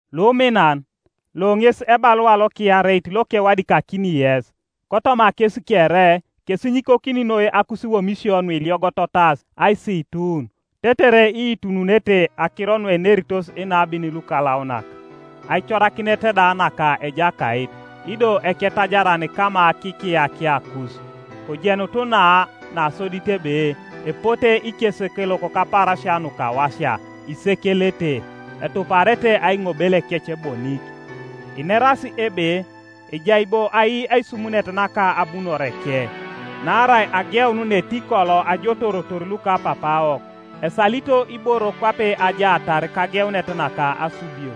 Luminan, lo ŋes ebalua lokiareit lokewadikakini yes; kotoma kes kere kesinyikokini noi akusiwomisio nuiliogototas aisiitun; tetere iitununete akiro nueneritos inabin lukalaunak, aicorakinet da naka Ejakait ido Eketajaran kama kikiyakiakus. Kojenutu na nasodit ebe epote ikesekelok kapaarasia nukawasia isekelete, etuparete aiŋobelekec bonik, inerasi ebe, “Ejai bo ai aisumunet naka abunoreke? Naarai ageun netikolo ajotoorotor lukapapaawok, esalito iboro kwape ajaatar kageunet naka asubio.”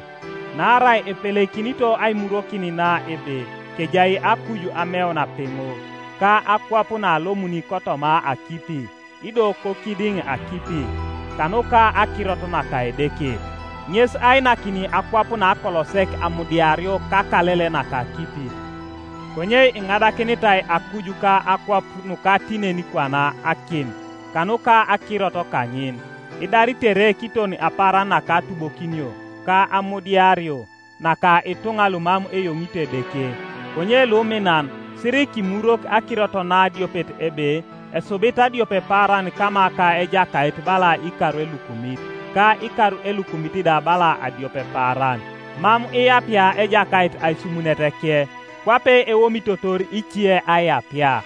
Naarai epeleikinito aimurwokin na ebe kejai akuj ameun apeŋo, ka akwap naalomuni kotoma akipi, ido kokidiŋ akipi, kanuka akirot naka Edeke, ŋes ainakini akwap nakolosek amudiario kakalele naka akipi. Konye iŋadakinitai akuj ka akwap nukatinenikwana akim, kanuka akirot kaŋin, idaritere kiton apaaran naka atubokinio ka amudiario naka ituŋa lumam eyoŋito Edeke. Konye luminan, sirikimurwok akirot na adiopet, ebe, esubit adiopepaaran kama ka Ejakait, bala ikar elukumit, ka ikar elukumit da bala adiopepaaran. Mam iyapia Ejakait aisumuneteke, kwape eomitotor ice aiyapia,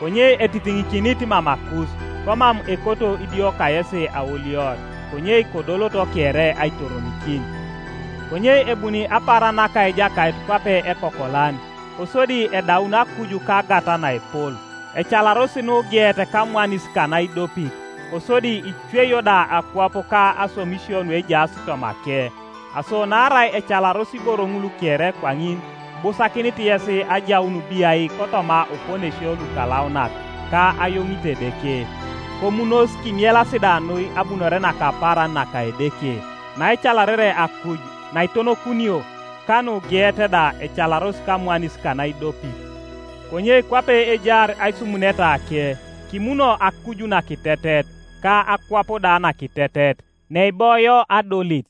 konye etitiŋikinit mamakus, komam ekoto idio kayesi aolior, konye kodoloto kere aitoronikin. Konye ebuni apaaran naka Ejakait kwape ekokolan, kosodi edaun akuj kagat naepol, ecalaros nugeet kamwanis kanaidopit, kosodi icweio da akwap ka aswamisio nuejaas tomake. Aso naarai ecalaros iboro ŋul kere kwaŋin, ibusakinit yes ajaun biai kotoma oponesio lukalaunak ka ayoŋit Edeke, komunos, kimielas da noi abunore naka apaaran naka Edeke, naecalarere akuj naitonokunio, ka nugeet da ecalaros kamwanis kanaidopit. Konye kwape ejaar aisumunetake, kimuno akuj nakitetet ka akwap da nakitetet, neiboio adolit.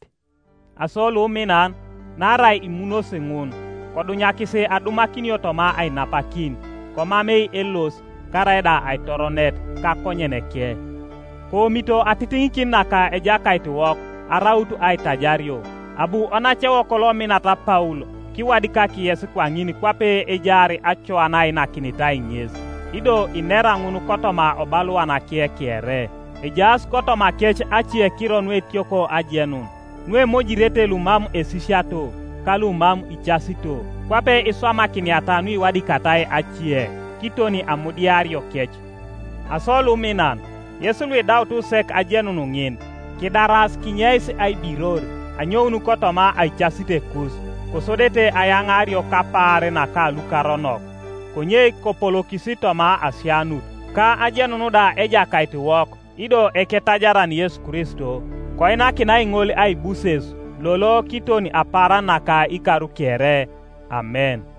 Aso luminan, naarai imunosi ŋun, kodunyakis adumakinio toma ainapakin, komamei elos karaida aitoronet, kakonyeneke. Koomito atitiŋikin naka Ejakaitiwok araut aitajario. Abu onacewok lominat Paul kiwadikak yes kwaŋin kwape ejaar acoa naainakinitai ŋes, ido inera ŋun kotoma obaluanake kere. Ejaas kotomakec acekiro nuetioko ajenun, nuemojirete lumam esisiato ka lumam icasito, kwape iswamakiniata nuiwadikatai ace, kiton amudiariokec. Aso luminan, yes luidaut sek ajenun ŋin, kidaras kinyeis aibiror anyoun kotoma aicasitekus, kosodete ayaŋaario kapaar naka lukaronok. Konye kopolokis toma asianut, ka ajenun da Ejakaitiwok ido Eketajaran Yesu Kristo. Koinakinai ŋol aibuses lolo kiton apaaran naka ikar kere. Amen.